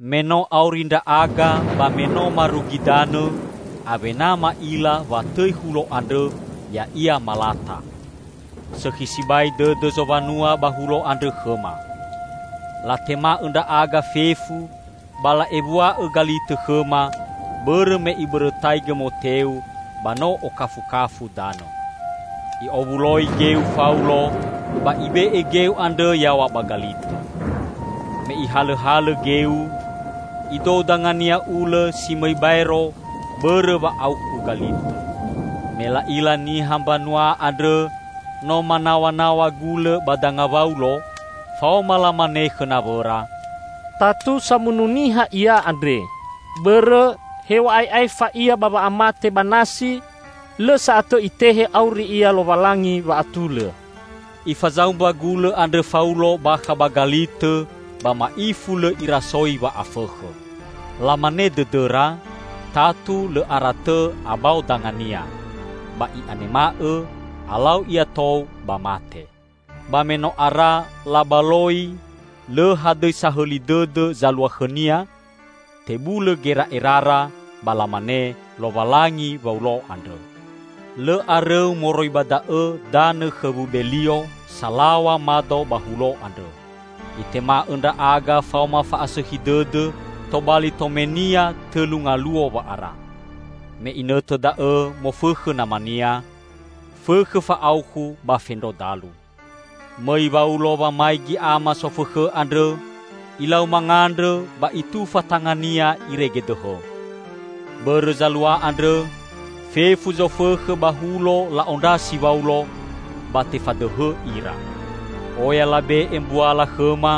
Me no auri ndra'aga ba me no marugi danõ, awena ma'ila wa tõi hulo andrõ ya'ia Malata. Sõkhi sibai dõdõ zowanua ba hulo andrõ khõma. Latema'õ ndra'aga fefu ba la'ewua'õ galitõ khõma, bõrõ me ibõrõtaigõ moteu ba no okafukafu danõ. I'owuloi geu Faulo, ba ibe'e geu andrõ yaw̃a ba galitõ. Me ihalõhalõ geu, idou dangania ulõ si mõi baero bõrõ wa'aukhu galitõ. Me la'ila niha mbanua andrõ no manaw̃anaw̃a gulõ ba danga Waulo, faoma lamane khõ nawõra, "Tatu samunu niha ia andre, bõrõ hew̃a'ae aefa ia ba wa'amate ba nasi, lõ sa'atõ itehe auri ia lowalangi wa'atulõ." Ifazaumba gulõ andrõ Faulo bakha ba galitõ ba ma'ifu lõ irasoi wa'afõkhõ. Lamane dõdõra, tatu lõ aratõ abao dangania ba i'anema'õ alau ia tou ba mate. Ba me no ara labaloi lõ hadõi sahõli dõdõ zalua khõnia, tebulõ gera'erara ba lamane lowalangi Waulo andrõ. Lõ arõu moroi ba da'õ danõ khõ Wubelio, salaw̃a mado ba hulo andrõ. Itema'õ ndra'aga faoma fa'asõkhi dõdõ, tobali tomenia tõlu ngaluo wa'ara. Me inõtõ da'õ mofõkhõ namania, fõkhõ fa'aukhu ba fendro dalu. Mõi Waulo wamaigi ama sofõkhõ andrõ ilau mangandrõ ba itufa tangania irege dõhõ. Bõrõ zalua andrõ fefu zofõkhõ ba hulo la'ondrasi Waulo, ba tefadõhõ ira. Oya labe'e mbuala khõma,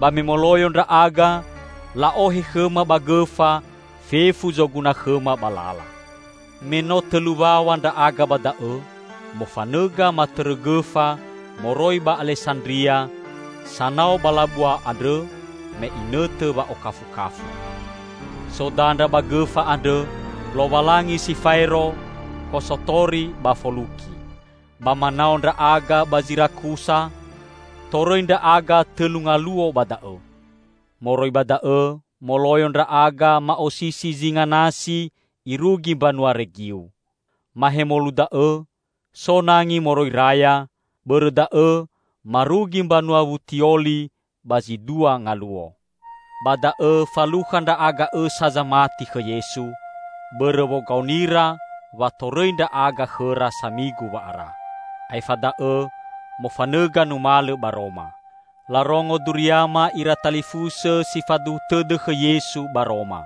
ba me moloyo ndra'aga, la'ohe khõma ba gõfa fefu zoguna khõma ba lala. Me no tõlu waw̃a ndra'aga ba da'õ, mofanõga matõrõ gõfa moroi ba Alesandria sanao ba labua andrõ me inõtõ wa'okafukafu. So dandra ba gõfa andrõ, "Lowalangi Si Faero Kosotori ba Foluki". Ba manao ndra'aga ba Zirakusa, torõi ndra'aga tõlu ngaluo ba da'õ. Moroi ba da'õ moloyo ndra'aga ma'osisi zinga nasi irugi mbanua Regiu. Mahemolu da'õ so nangi moroi raya, bõrõ da'õ marugi mbanua Wutioli ba zi dua ngaluo. Ba da'õ falukha ndra'aga õsa zamati khõ Yesu, bõrõ wogaonira wa torõi ndra'aga khõra samigu wa'ara. Aefa da'õ mofanõga numalõ ba Roma. Larongo duriama ira talifusõ si faduhu tõdõ khõ Yesu ba Roma.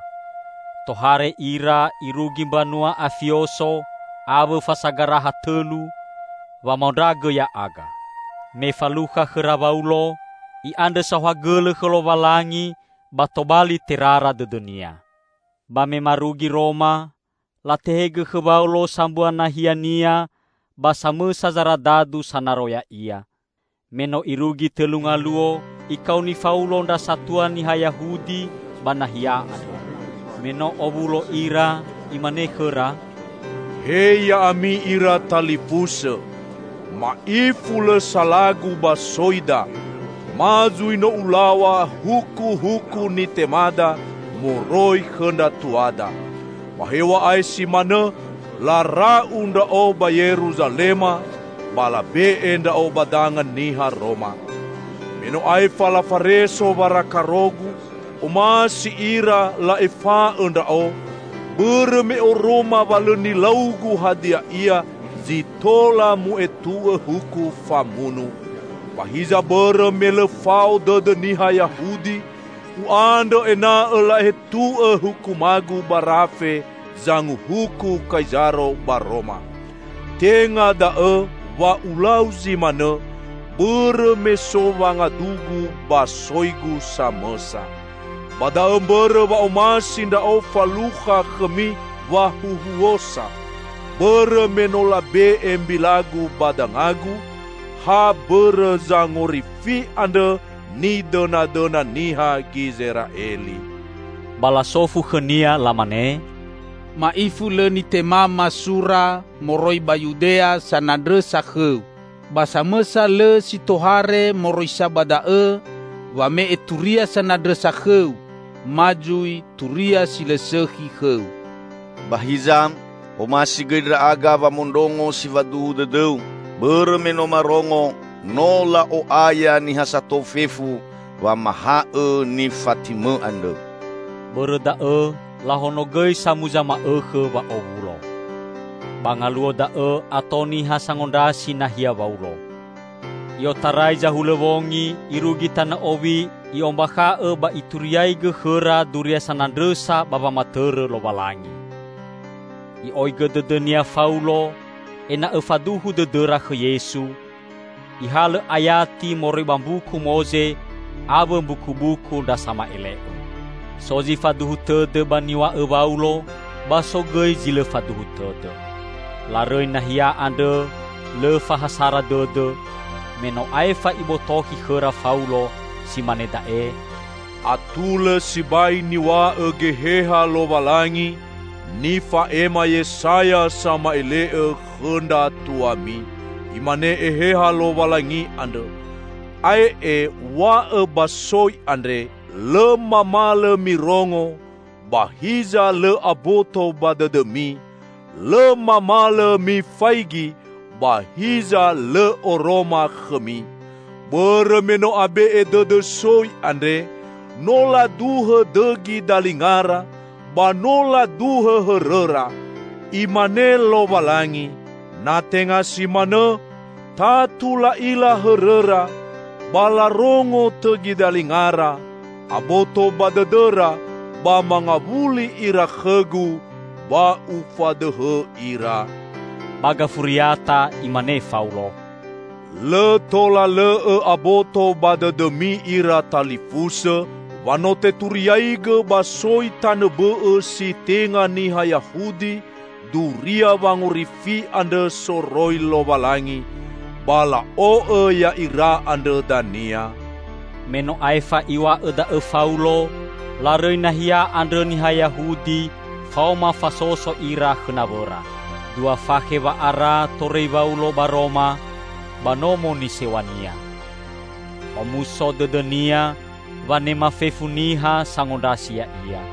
Tohare ira irugi mbanua Afioso awõ Fasagaraha Tõlu, wamaondragõ ya'aga. Me falukha khõra Waulo, i'andrõ saohagõlõ khõ Lowalangi ba tobali terara dõdõnia. Ba me marugi Roma, latehegõ khõ Waulo sambua nahiania ba samõsa zaradadu sanaro ya'ia. Me no irugi tõlu ngaluo, ikaoni Faulo ndra satua niha Yahudi ba nahia andrõ. Me no owulo ira imane khõra, "He ya'ami ira talifusõ! Ma'ifu lõ salagu ba soida, ma zui no ulaw̃a hukuhuku nitemada moroi khõ ndra tuada. Ba hew̃a'ae si manõ lara'u ndra'o ba Yeruzalema ba labe'e ndra'o ba danga niha Roma. Me no aefa lafareso warakarogu, omasi ira la'efa'õ ndra'o, bõrõ me oroma wa lõ nilaugu hadia ia zi tola mu'etu'õ huku famunu. Ba hiza bõrõ me lõ fao dõdõ niha Yahudi, u'andrõ ena'õ la'etu'õ hukumagu ba rafe zanguhuku Kaizaro ba Roma. Tenga da'õ wa ulau zi manõ bõrõ me so wangadugu ba soigu samõsa. Ba da'õ mbõrõ wa omasi ndra'o falukha khõmi wahuhuosa; bõrõ me no labe'e mbilagu ba dangagu, ha bõrõ Zangorifi andrõ nidõnadõna niha Gizera'eli." Ba lasofu khõnia lamane, "Ma'ifu lõ nitemama sura moroi ba Yudea sanandrõsa khõu. Ba samõsa lõ si tohare moroi sa ba da'õ wame'e turia sanandrõsa khõu ma zui turia si lõ sõkhi khõu. Ba hiza omasi gõi ndra'aga wamondrongo si faduhu dõdõu, bõrõ me no marongo no la'o'aya niha sato fefu wamahaõ nifatimõ andrõ." Bõrõ da'õ lahonogõi samuza ma'õkhõ wa'owulo. Ba ngaluo da'õ ato niha sangondrasi nahia Waulo. I'otarai zahulõwongi irugi tanõ owi i'ombakha'õ ba ituriaigõ khõra duria sanandrõsa ba wamatõrõ Lowalangi. I'oigõ dõdõnia Faulo ena'õ faduhu dõdõra khõ Yesu, ihalõ ayati moroi ba Mbuku Moze awõ Mbukubuku ndra Sama'ele'õ. So zi faduhu tõdõ ba niw̃a'õ Waulo, ba so gõi zi lõ faduhu tõdõ. Larõi nahia andrõ lõ fahasara dõdõ, me no aefa ibotokhi khõra Faulo si mane da'e, "Atulõ sibai niw̃a'õ Geheha Lowalangi, nifa'ema Yesaya sama'ele'õ khõ ndra tuami! Imane Eheha Lowalangi andrõ, 'Ae'e w̃a'õ ba soi andre: Lõ mamalõ mirongo, ba hiza lõ aboto ba dõdõmi; lõ mamalõ mifaigi, ba hiza lõ oroma khõmi. Bõrõ me no abe'e dõdõ soi andre, no laduhõ dõgi dalingara, ba no laduhõ hõrõra. Imane Lowalangi, na tenga si manõ, tatu la'ila hõrõra ba larongo tõgi dalingara aboto ba dõdõra ba mangawuli ira khõ-Gu, ba Ufadõhõ ira.'" Ba gafuriata imane Faulo, "Lõ tola lõ'õ aboto ba dõdõmi ira talifusõ wa no teturiaigõ ba soi tanõ bõ'õ si tenga niha Yahudi duria wangorifi andrõ soroi Lowalangi. Ba la'o'õ ya'ira andrõ dania." [Me no aefa iw̃a'õ da'õ Faulo, larõi nahia andrõ niha Yahudi faoma fasoso ira khõ nawõra.] Dua fakhe wa'ara torõi Waulo ba Roma, ba nomo nisew̃ania. Omuso dõdõnia wanema fefu niha sangondrasi ya'ia.